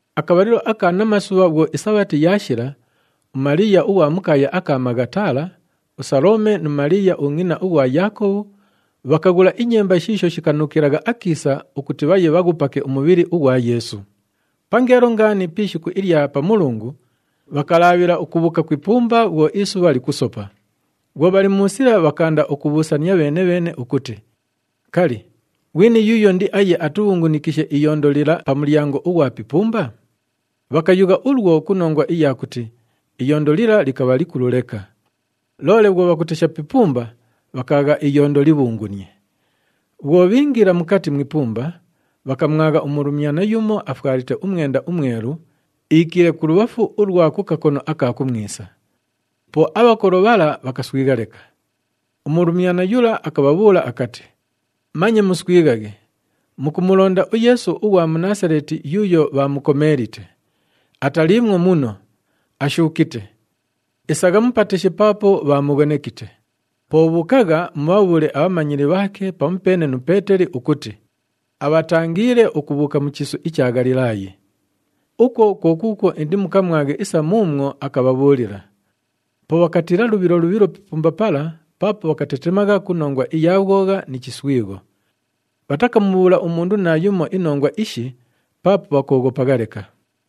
Akabhalilo aka namasubha bhwo iSabhati yaashila, uMaliiya ughwa mu kaaya aka Maghatala, uSalome nu Maliiya ungʼina ughwa Yaakobhu bhakaghula inyemba shiisho shikanuukilagha akiisa ukuti bhaye bhaghupake umubhili ughwa Yeesu. Pangeelo ngaani pi ishiku ilya Pamulungu, bhakalaabhila ukubhuuka ku ipumba bhwo isubha likusopa. Bhwo bhali mu sila, bhakaanda ukubhuusania bheene-bheene ukuti, “Kali, ghwini yuuyo indiaye atubhungunikishe iyondo lila pa mulyango ughwa pi ipumba?” Bhakayugha ulwo ku nongwa iya kuti iyondo lila likabha likulu leka. Loole bhwo bhakutesha pi ipumba, bhakaagha iyondo libhungunie. Bhwo bhiingila mukati mu ipumba, bhakamwagha umulumyana yumo afwalite umwenda umwelu, iikiile kulubhafu ulwa ku kakono aka kumwisa. Po abhakolo bhala bhakaswigha leka. Umulumyana yula akabhabhuula akati, “Manye muswighaghe. Mukumulonda uYeesu ughwa mu Naasaleeti yuuyo bhaamukomeelite. Ataliimwo muno! Ashuukite! Isagha mupateshe paapo bhaamughonekite. Po bhuukagha, mubhabhuule abhamanyili bhaake pamupeene nu Peeteli ukuti, abhatangiile ukubhuuka mu chiisu icha Ghalilaayi. Ukwo kwo kuukwo indimukamwaghe isa muumwo akabhabhuulila.” Po bhakatiila lubhilo lubhilo pi ipumba pala paapo bhakatetemagha ku nongwa iya bhwogha ni chiswigho. Bhatakamubhuula umundu naayumo inongwa ishi paapo bhakooghopagha leka. [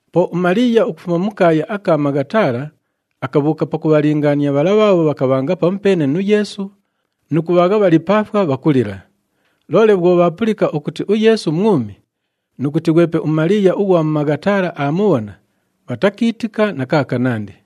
Po uMaliiya ukufuma mu kaaya aka Maghatala akabhuuka pakubhalingaania bhala bhaabho bhakabhanga pamupeene nu Yeesu nu kubhaagha bhali pa ifwa bhakulila. Loole bhwo bhaapulika ukuti uYeesu mwumi nu kuti ghwepe uMaliiya ughwa mu Maghatala aamubhona, bhatakiitika na kaakanandi.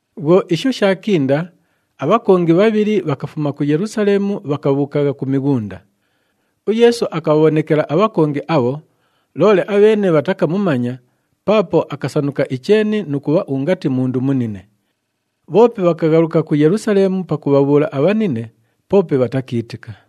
Bhwo isho shaakinda, abhakongi bhabhili bhakafuma ku Yelusaleemu, bhakabhuukagha ku mighunda. UYeesu akabhabhonekela abhakongi abho, loole abheene bhatakamumanya paapo akasanuka icheeni nu kubha ungati mundu munine. Bhoope bhakaghaluka ku Yelusaleemu pakubhabhuula abhanine, poope bhatakiitika.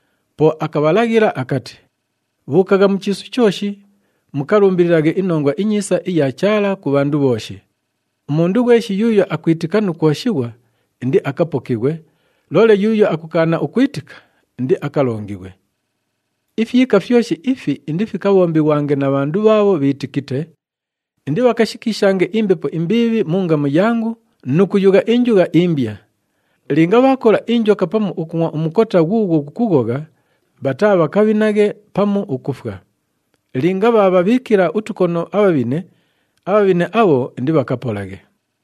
Po akabhalaghila akati, “Bhuukagha mu chiisu chooshi, mukalumbililaghe iNongwa iNyiisa iya Chaala ku bhandu bhooshi. Umundu ghweshi yuuyo akwitika nu kwoshighwa, indiakapokighwe, loole yuuyo akukaana ukwitika, indiakalongighwe. Ifyika fyoshi ifi indifikabhombighwange na bhandu bhaabho bhiitikite, indibhakashikiishange imbepo imbiibhi mu ngamu yangu nu kuyugha injugha imbya. Linga bhaakola injoka pamu ukungʼwa umukota ghuughwo ghukughogha, bhataabhakabhinaghe pamu ukufwa. Linga bhaabhabhiikila utukono abhabhine, abhabhine abho indibhakapolaghe.”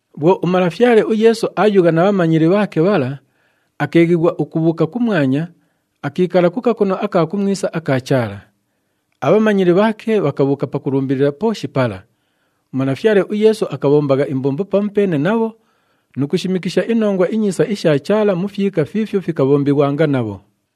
Bhwo uMalafyale uYeesu aayugha na bhamanyili bhaake bhala, akeeghighwa ukubhuuka kumwanya, akiikala ku kakono aka kumwisa aka Chaala. Abhamanyili bhaake bhakabhuuka pakulumbilila pooshi pala. UMalafyale uYeesu akabhombagha imbombo pamupeene nabho nu kushimikisha iNongwa iNyiisa isha Chaala mu fyika fiifyo fikabhombighwanga nabho.]